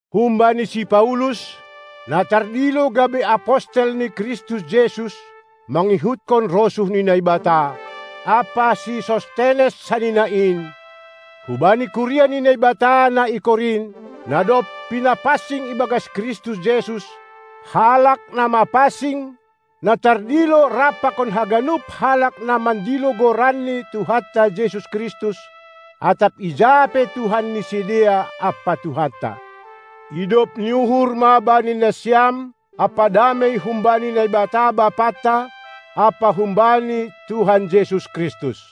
Humbani si Paulus, na tardilo gabe apostel ni Kristus Jesus mangihutkon rosuh ni Naibata, ampa si Sostenes sanina in, hubani kuria ni Naibata na i Korint, na dob pinapansing ibagas Kristus Jesus, halak na mapansing, na tardilo rap pakon haganup halak na mandilo Goran ni Tuhanta Jesus Kristus atap ija pe Tuhan ni sidea ampa Tuhanta: Idop ni uhur ma bani nasiam ampa damei humbani Naibata Bapanta ampa humbani Tuhan Jesus Kristus!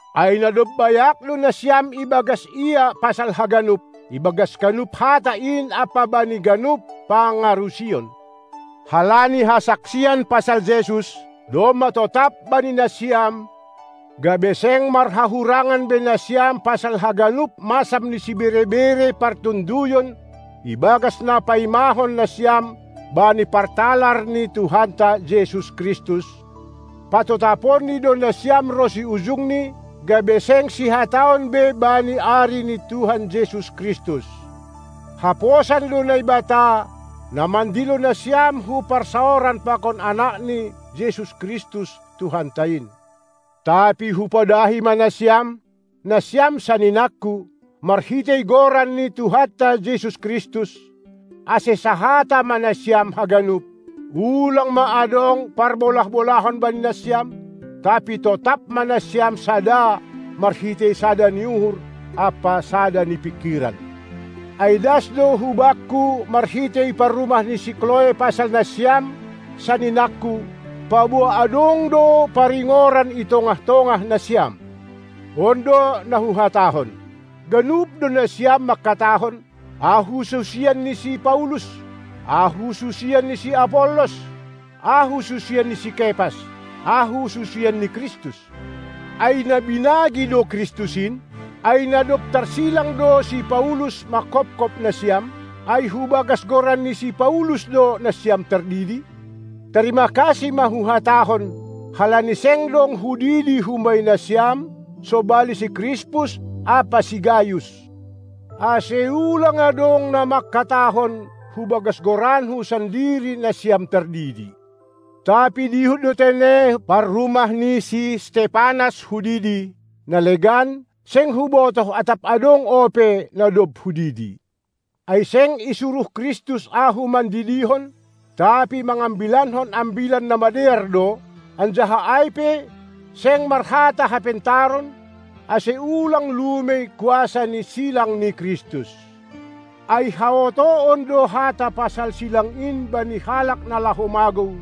Ai na dob bayak do nasiam ibagas Ia pasal haganup, ibagas ganup hata in ampa bani ganup pangarusion, halani hasaksian pasal Jesus domma totap bani nasiam, gabe seng marhahurangan be nasiam pasal haganup masam ni sibere-bere partonduyon ibagas na paimahon nasiam bani partalar ni Tuhanta Jesus Kristus. Patotaponni do nasiam ronsi ujungni, gabe seng sihataon be bani ari ni Tuhan Jesus Kristus. Haposan do Naibata, na mandilo nasiam hu parsaoran pakon AnakNi Jesus Kristus Tuhanta in. Tapi hupodahi ma nasiam, nasiam saninangku, marhitei Goran ni Tuhanta Jesus Kristus, ase sahata ma nasiam haganup, ulang ma adong parbolah-bolahan bani nasiam, tapi totap ma nasiam sada marhitei sada ni uhur ampa sada ni pingkiran. Ai das do hubakku marhitei parrumah ni si Kloe pasal nasiam, saninangku, paboa adong do paringoran i tongah-tongah nasiam. On do na huhatahon: Ganup do nasiam mangkatahon: Ahu susian ni si Paulus! Ahu susian ni si Apollos! Ahu susian ni si Kepas! Ahu susian ni Kristus! Ai na binagi do Kristus in? Ai na dob tarsilang do si Paulus manghophop nasiam? Ai hubagas goran ni si Paulus do nasiam tardidi? Tarima kasih ma huhatahon, halani seng dong hudidi humbani nasiam sobali si Krispus ampa si Gayus, ase ulang adong na mangkatahon hubagas goranku sandiri nasiam tardidi. Tapi dihut do tene parrumah ni si Stepanas hudidi; na legan, seng hubotoh atap adong ope, na dob hudidi. Ai seng isuruh Kristus ahu mandidihon, tapi mangambilankon Ambilan Namadear do, anjaha ai pe seng marhata hapentaron, ase ulang lumei kuasa ni silang ni Kristus. Ai haotoon do hata pasal silang in bani halak na laho magou,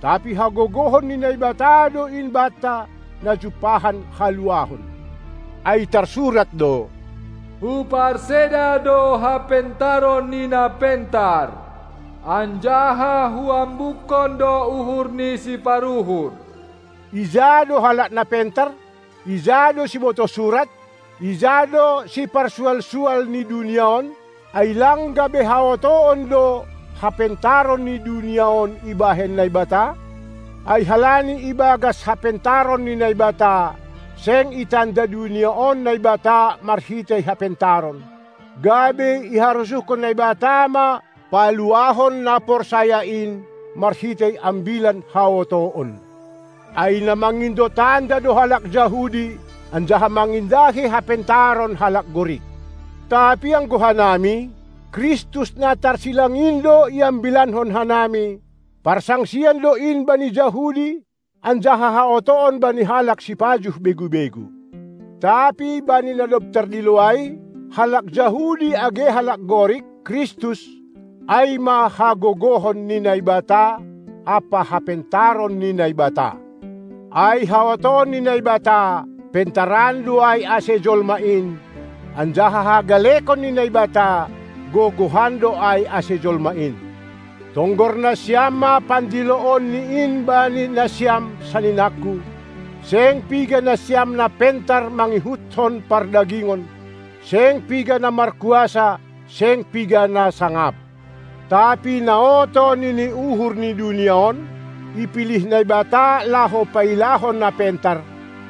tapi hagogohon ni Naibata do in banta, na jumpahan haluahon. Ai tarsurat do: Huparseda do hapentaron ni na pentar, anjaha huambukkon do uhur ni siparuhur. Ija do halak na pentar? Ija do sibotoh surat? Ija do siparsual-sual ni dunia on? Ai lang gabe haotoon do hapentaron ni dunia on ibahen Naibata? Ai halani ibagas hapentaron ni Naibata, seng itanda dunia on Naibata marhitei hapentaron, gabe iharosuhkon Naibata ma paluahon na porsaya in marhitei ambilan haotoon. Ai na mangindo tanda do halak Jahudi, anjaha mangindahi hapentaron halak Gorik. Tapi anggo hanami, Kristus na tarsilang in do iambilankon hanami; parsangsian do in bani Jahudi anjaha haotoon bani halak sipajuh begu-begu. Tapi bani na dob tardilo ai, halak Jahudi age halak Gorik, Kristus, ai ma hagogohon ni Naibata ampa hapentaron ni Naibata. Ai haotoon ni Naibata, pentaran do ai ase jolma in, anjaha hagalekon ni Naibata, gogohan do ai ase jolma in. Tonggor nasiam ma pandiloonni in bani nasiam, saninangku, seng piga nasiam na pentar mangihutkon pardagingon, seng piga na markuasa, seng piga na sangap. Tapi na oto nini uhur ni dunia on, ipilih Naibata laho pailahon na pentar,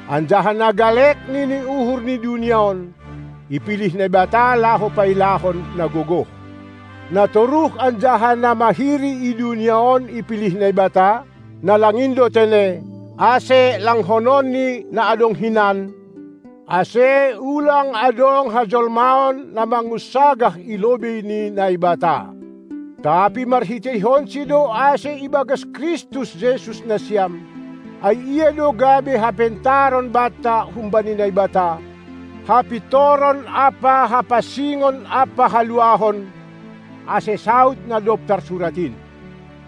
anjaha na galek nini uhur ni dunia on, ipilih Naibata laho pailahon na gogoh. Na toruh anjaha na mahiri i dunia on ipilih Naibata, na lang in do tene, ase langkononni na adong hinan, ase ulang adong hajolmaon na mangunsagah i lobei ni Naibata. Tapi marhiteihonsi do ase ibagas Kristus Jesus nasiam, ai Ia do gabe hapentaron banta humbani Naibata, hapintoron ampa hapansingon ampa haluahon, ase saud na dob tarsurat in: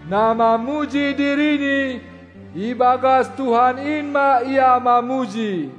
Na mamuji dirini, ibagas Tuhan in ma ia mamuji!